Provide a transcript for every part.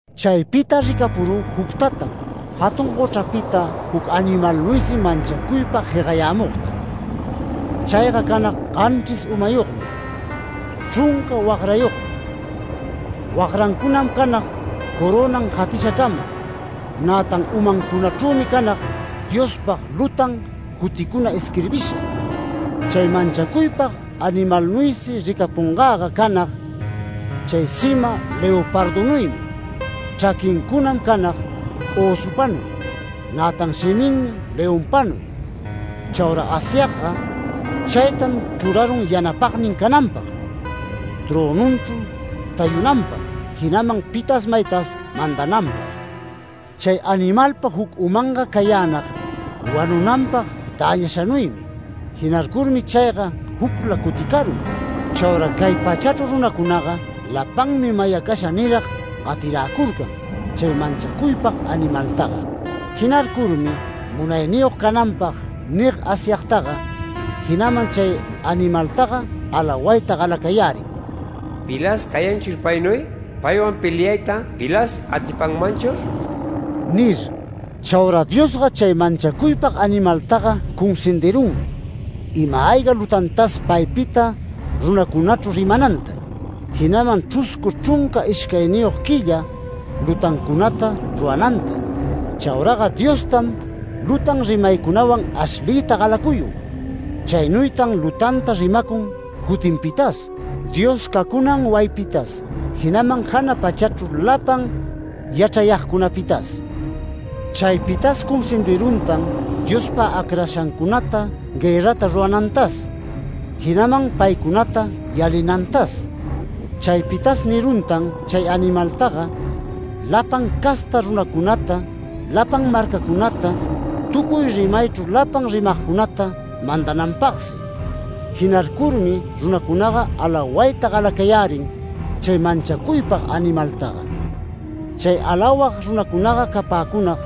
Chaypita ricapurü juctatam, jatun gochrapita juc animalnuysi manchacuypag jegayämugta. Chayga canag ganchris umayogmi, chrunca wagrayogmi. Wagrancunam canag corönan jatishacama, nätan umancunachrümi canag Diospag lutan juticuna isquirbisha. Chay manchacuypag animalnuysi ricapungäga canag chay sima leopardunuymi. Chraquincunam canag ösupanuy, nätan shiminmi leonpanuy. Chaura Asyagga chaytam chrurarun yanapagnin cananpag, trönunchru tayunanpag, jinaman pitas maytas mandananpag. Chay animalpa juc umanga cayänag wanunanpag däñashanuymi. Jinarcurmi chayga jucla cuticarun. Chaura cay pachachru runacunaga lapanmi mayacasha nirag gatiräcurcan chay manchacuypag animaltaga. Jinarcurmi munayniyog cananpag nig Asyagtaga, jinaman chay animaltaga alawayta galacayärin “¿Pilas cayanchur paynuy, paywan peliayta pilas atipanmanchur?” nir. Chaura Diosga chay manchacuypag animaltaga cunsindirunmi, ima-ayga lutantas paypita runacunachru rimananta, jinaman chruscu chrunca ishcayniyog quilla lutancunata rurananta. Chauraga Diostam lutan rimaycunawan ashliyta galacuyun. Chaynuytan lutanta rimacun jutinpitas, Dios cacunman wayipitas, jinaman jana pachachru lapan yachrayagcunapitas. Chaypitas cunsindiruntan Diospa acrashancunata guërrata ruranantas, jinaman paycunata yalinantas. Chaypitas niruntan chay animaltaga lapan casta runacunata, lapan marcacunata, tucuy rimaychru lapan rimagcunata mandananpagsi. Jinarcurmi runacunaga alawayta galacayärin chay manchacuypag animaltaga. Chay alawag runacunaga capäcunag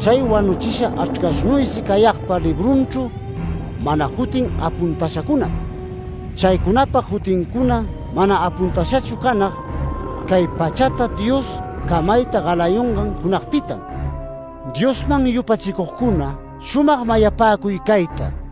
chay wanuchisha Achrcashnuysi cayagpa librunchru mana jutin apuntashacunam. Chaycunapa jutincuna mana apuntashachu canag cay pachata Dios camayta galayungan junagpitam. Diosman yupachicugcuna shumag mayapäcuy cayta: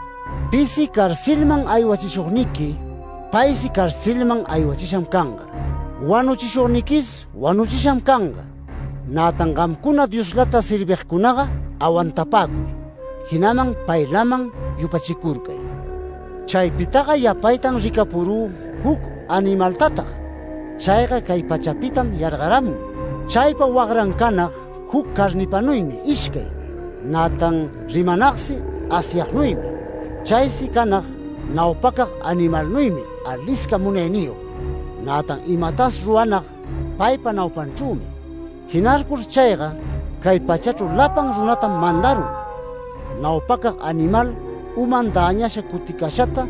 Pisi carcelman aywachishugniqui, paysi carcelman aywachisham canga. Wanuchishugniquis wanuchisham canga. Nätan gamcuna Dioslata servigcunaga awantapäcuy, jinaman paylaman yupachicurcay. Chaypitaga yapaytan ricapurü juc animaltatag. Chayga cay pachapitam yargaramun. Chaypa wagran canag juc carnipanuymi ishcay, nätan rimanagsi Asyagnuymi. Chaysi canag naupacag animalnuymi alisca munayniyog, nätan imatas ruranag paypa naupanchrümi. Jinarcur chayga cay pachachru lapan runatam mandarun, naupacag animal uman däñasha cuticashata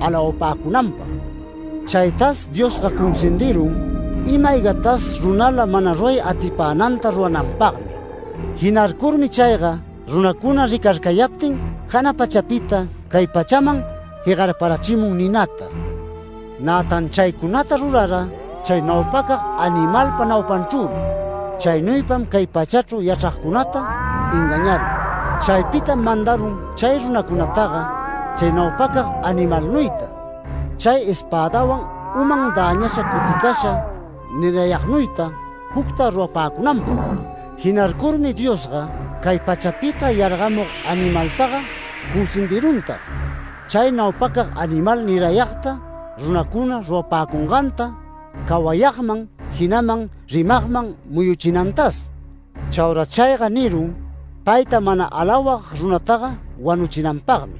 alawapäcunanpag. Chaytas Diosga cunsindirun ima-aygatas runala mana ruray atipänanta rurananpagmi. Jinarcurmi chayga runacuna ricarcayaptin jana pachapita cay pachaman jegarparachimun ninata. Nätan chaycunata rurara chay naupacag animalpa naupanchrümi. Chaynuypam cay pachachru yachragcunata engañarun. Chaypitam mandarun chay runacunataga, chay naupacag animalnuyta, chay espädawan uman däñasha cuticasha nirayagnuyta jucta rurapäcunanpag. Jinarcurmi Diosga, cay pachapita yargamug animaltaga cunsindiruntag, chay naupacag animal nirayagta runacuna rurapäcunganta cawayagman, jinaman rimagman muyuchinantas. Chaura chayga nirun payta mana alawag runataga wanuchinanpagmi.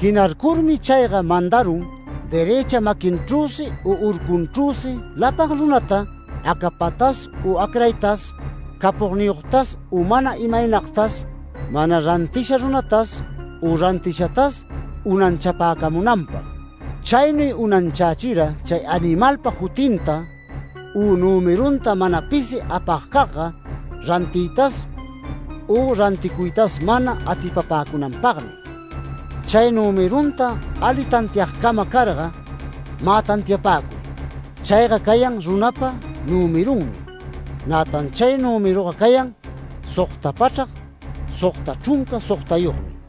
Jinarcurmi chayga mandarun derëcha maquinchrüsi u urcunchrüsi lapan runata, acapatas u acraytas, capogniyogtas u mana imaynagtas, mana rantisha runatas u rantishatas unanchapäcamunanpag. Chaynuy unanchächira chay animalpa jutinta u nümerunta mana pisi apagcagga, rantiytas u ranticuytas mana atipapäcunanpagmi. Chay nümerunta ali tantiagcama carga, mä tantiapäcuy. Chayga cayan runapa nümerunmi. Nätan chay nümeruga cayan, sogta pachrac sogta chrunca sogtayogmi.